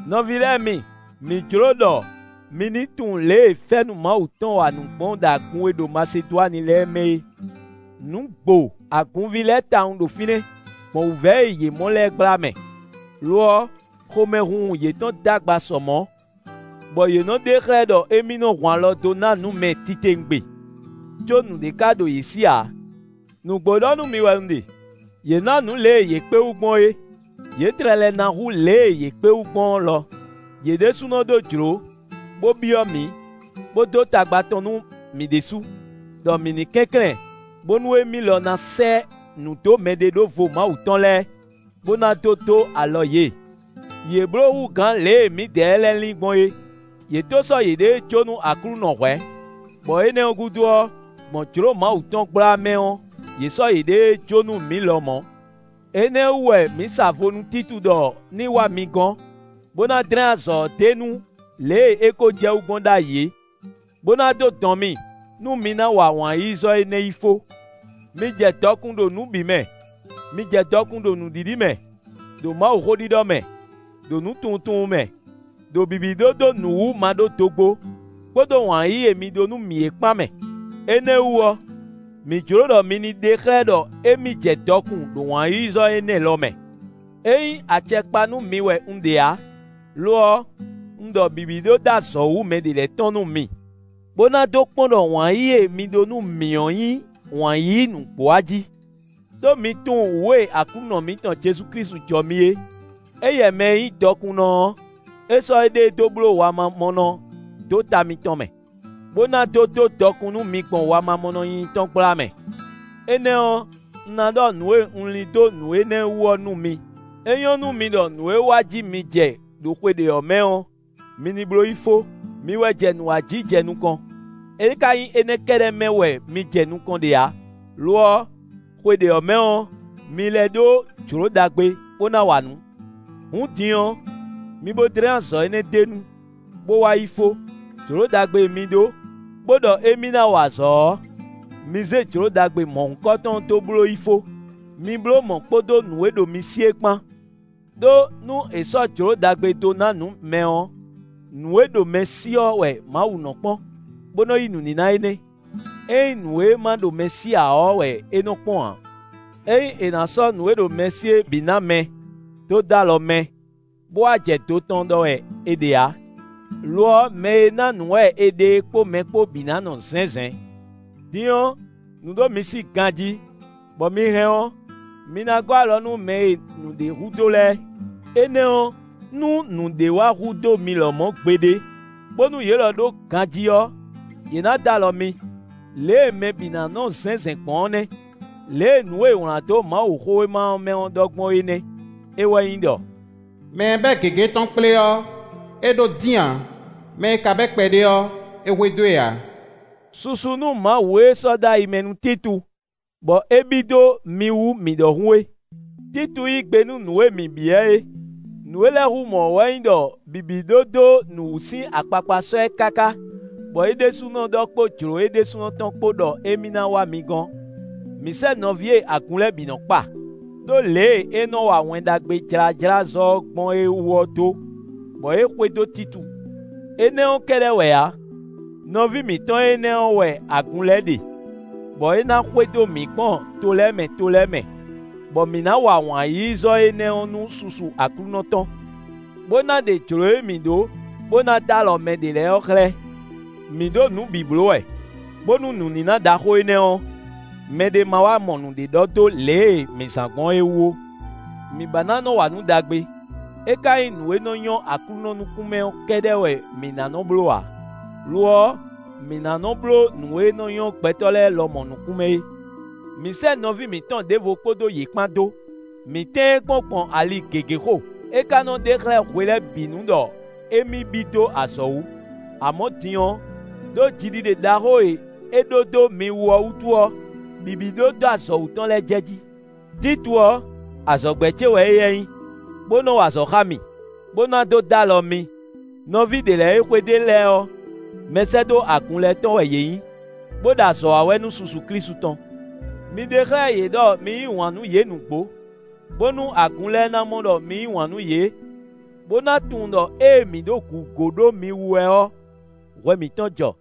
Nɔví lɛ́ɛ mi, mǐ jló ɖɔ mi ní tunwun lě e fɛ́nú Mawu tɔn wa nǔ gbɔn ɖo agun e ɖo Masedwani lɛ́ɛ mɛ é. Nǔ gbo agunví lɛ́ɛ tawun ɖo fínɛ́, gbɔn wǔvɛ́ e yě mɔ lɛ́ɛ gbla mɛ. Lo ɔ́, xomɛhunhun yětɔn d'agba sɔ mɔ̌, bɔ yě nɔ́ ɖe xlɛ́ ɖɔ émí nɔ hun alɔ dó ná nǔ mɛ titewungbe; có nǔɖé ka ɖo yě sí ǎ. Nǔgbó ɖɔ nú mi wɛ un ɖe; yě ná nǔ lě e yě kpé wú gbɔn é; yě tlɛ lɛ́ ná hú lě e yě kpé wú gbɔn ɔ́ lɔ; yě ɖésúnɔ ɖó jlǒ, bó byɔ́ mǐ, bó dó tagba tɔn nú mǐ ɖésú, ɖɔ mǐ ní kɛnklɛ́n, bónú émí lɔ ná sɛ́ nǔ dó mɛɖeɖóvo Mawu tɔn lɛ́ɛ, bó ná dó dó alɔ yě. Yě bló hú gǎn lě e mǐdɛɛ lɛ́ɛ lin gbɔn é; yě tó sɔ́ yěɖée jó nú Aklúnɔ hwɛ̌, bɔ énɛ́ ɔ́ gúdo ɔ́, gbɔn jlǒ Mawu tɔn gbla mɛ ɔ́, yě sɔ́ yěɖée jó nú mǐ lɔmɔ̌. Énɛ́ ɔ́ wú wɛ mǐ sa vo nú Títu ɖɔ ní wá mi gɔ́n, bó ná dlɛ́n azɔ̌ ɔ́ d'é nu lě e é kó jɛ wú gbɔn ɖ'ayǐ é, bó ná dó dɔn mi nú mi ná wa wǎn-yíyízɔ́ énɛ́ yi fó. Mi jɛ dɔkun ɖo nǔ bǐ mɛ: mi jɛ dɔkun ɖo nǔɖiɖi mɛ, ɖo Mawuxó ɖiɖɔ mɛ, ɖo nǔtunwuntunwun mɛ, ɖo bǐbí ɖó dó nǔ wú maɖódogbó, kpódó wǎn yíyí e mi ɖó nú mǐ é kpán mɛ. Énɛ́ ɔ́ wú ɔ́, mǐ jló ɖɔ mi ní ɖe xlɛ́ ɖɔ émí jɛ dɔkun ɖo wǎn-yíyízɔ́ énɛ́ lɔ mɛ. É nyí acɛ kpa nú mi wɛ un ɖe ǎ; lo ɔ́, un ɖɔ bǐbí ɖó dó azɔ̌ wǔ mɛɖé lɛ́ɛ tɔn nú mi, bó ná dó kpɔ́n ɖɔ wǎn yíyí e mi ɖó nú mǐ ɔ́ nyí wǎn yíyí nǔgbó a jí. Đó mi tunwun wǔ e Aklúnɔ mǐtɔn Jezu Klísu jɔ mi é: éyɛ́ mɛ e nyí dɔkunnɔ ɔ́, é sɔ́ éɖée dó bló wamamɔnɔ dó ta mitɔn mɛ, bó ná dó dó dɔkun nú mi gbɔn wamamɔnɔ nyínyí tɔn gbla mɛ. Énɛ́ ɔ́, un ná ɖɔ nǔ e un lin dó nǔ énɛ́ wú ɔ́ nú mi: é nyɔ́ nú mi ɖɔ nǔ e wa ji mi jɛ ɖo xwe ɖě ɔ́ mɛ ɔ́, mi ní bló yi fó. Mi wɛ jɛ nǔ wa jí jɛ nukɔn; é ka nyí énɛ́ kɛ́ɖɛ́ mɛ wɛ mi jɛ nukɔn ɖe ǎ; lo ɔ́, xwe ɖě ɔ́ mɛ ɔ́, mi lɛ́ ɖó jlǒ ɖagbe, bó ná wa nǔ. Hǔn din ɔ́, mi bo dlɛ́n azɔ̌ énɛ́ d'é nu, bó wa yi fó; jlǒ ɖagbe e mi ɖó, bó ɖɔ émí ná wa azɔ̌ ɔ́, mi zé jlǒ ɖagbe mɔ̌hunkɔtɔn dó bló yi fó; mi bló mɔ̌ kpódó nǔ e ɖo mi sí é kpán. Đó, nú è sɔ́ jlǒ ɖagbe dó ná nǔ mɛ ɔ́, nǔ e ɖo mɛ sí ɔ́ wɛ Mawu nɔ́ kpɔ́n, bó nɔ yí nǔníná énɛ́; é nyí nǔ e ma ɖo mɛ sí ǎ ɔ́ wɛ é nɔ kpɔ́n ǎ. É nyí è nǎ sɔ́ nǔ e ɖo mɛ sí é bǐ ná mɛ dó dó alɔ mɛ, bó wá jɛ do tɔn ɖɔ wɛ è ɖe ǎ; lo ɔ́, mɛ e ná nǔ wɛ è ɖe é kpó mɛ kpó bǐ ná nɔ zɛ̌nzɛ̌n. Din ɔ́, nǔ ɖo mi sí ganjí, bɔ mi hɛn ɔ́, mi ná gɔ́ alɔ nú mɛ e nǔɖé hudó lɛ́ɛ. Énɛ́ ɔ́, nú nǔɖé wá hudó mi lɔmɔ̌ gbeɖé, bónú yě lɔ ɖó ganjí ɔ́, yě ná dó alɔ mi. Lě e mɛ bǐ ná nɔ zɛ̌nzɛ̌n gbɔn ɔ́ nɛ́. Lě e nǔ e è wlán dó Mawuxówéma ɔ́ mɛ ɔ́ ɖɔ gbɔn é nɛ́; é wɛ nyí ɖɔ: “Mɛ e bɛ́ gěgé tɔn kplé ɔ́, é ɖó dín ǎ; mɛ e ka bɛ́ kpɛɖé ɔ́, é hwedó e ǎ.” Susu nú Mawu e sɔ́ dó ayi mɛ nú Títu, bɔ é bí dó mi wú mǐ ɖɔhun é! Títu yí gbe nú nǔ e mǐ byɔ́ ɛ é; nǔ e lɛ́ hú mɔ̌ ɔ́ wɛ nyí ɖɔ bǐbí ɖó dó nǔ wú sín akpakpa sɔ́ ɛ káká bɔ é ɖésúnɔ ɖɔ kpó jlǒ é ɖésúnɔ tɔn kpó ɖɔ émí ná wá mi gɔ́n. Mǐ sɛ́ nɔví e agun lɛ́ɛ bǐ nɔ kpa, ɖó lě e é nɔ wa Wɛn Ɖagbe jlájlázɔ́ ɔ́ gbɔn é wú ɔ́ dó, bɔ é xwedó Títu. Énɛ́ ɔ́ kɛ́ɖɛ́ wɛ ǎ; nɔví mǐtɔn énɛ́ ɔ́ wɛ agun lɛ́ɛ ɖe, bɔ é ná xwedó mǐ gbɔn to lɛ́ɛ mɛ to lɛ́ɛ mɛ, bɔ mǐ ná wa wǎn-yíyízɔ́ énɛ́ ɔ́ nú susu Aklúnɔ tɔn, bó ná ɖe jlǒ e mǐ ɖó, bó ná dó alɔ mɛ ɖě lɛ́ɛ ɔ́ xlɛ́. Mǐ ɖo nǔ bǐ bló wɛ, bónú nǔníná ɖaxó énɛ́ ɔ́, mɛɖé ma wá mɔ nǔɖé ɖɔ dó lě e mǐ zán gbɔn é wú ó. Mǐ ba ná nɔ́ wa nǔ ɖagbe; é ka nyí nǔ e nɔ́ nyɔ́ Aklúnɔ nukún mɛ ɔ́ kɛ́ɖɛ́ wɛ mǐ ná nɔ́ bló ǎ; lo ɔ́, mǐ ná nɔ́ bló nǔ e nɔ́ nyɔ́ gbɛtɔ́ lɛ́ɛ lɔmɔ̌ nukún mɛ é. Mǐ sɛ́ nɔví mǐtɔn ɖěvo kpódó yě kpán dó; mǐ tɛ́n ɛ kpɔ́n gbɔn ali gěgé xo; é ka nɔ ɖe xlɛ́ hwe lɛ́ɛ bǐ nu ɖɔ émí bí dó azɔ̌ wú; amɔ̌ din ɔ́, ɖó jiɖiɖe ɖaxó e é ɖó dó mi wú ɔ́ wútu ɔ́, bǐbí ɖó dó azɔ̌ wú tɔn lɛ́ jɛjí. Títu ɔ́, azɔ̌gbɛ́ ce wɛ éyɛ́ nyí, bó nɔ́ wa azɔ̌ xá mì, bó ná dó dó alɔ mi. Nɔví ɖě lɛ́ɛ e xwedó e lɛ́ɛ ɔ́, mɛsɛ́dó agun lɛ́ɛ tɔn wɛ yě nyí, bó ɖo azɔ̌ wa wɛ nú susu Klísu tɔn. Mi ɖe xlɛ́ yě ɖɔ mi yí wǎn nú yě nǔgbó, bónú agun lɛ́ɛ ná mɔ ɖɔ mi yí wǎn nú yě, bó ná tunwun ɖɔ ée mǐ ɖo gǔgó ɖó mi wú wɛ ɔ́, hwɛ mǐtɔn jɔ.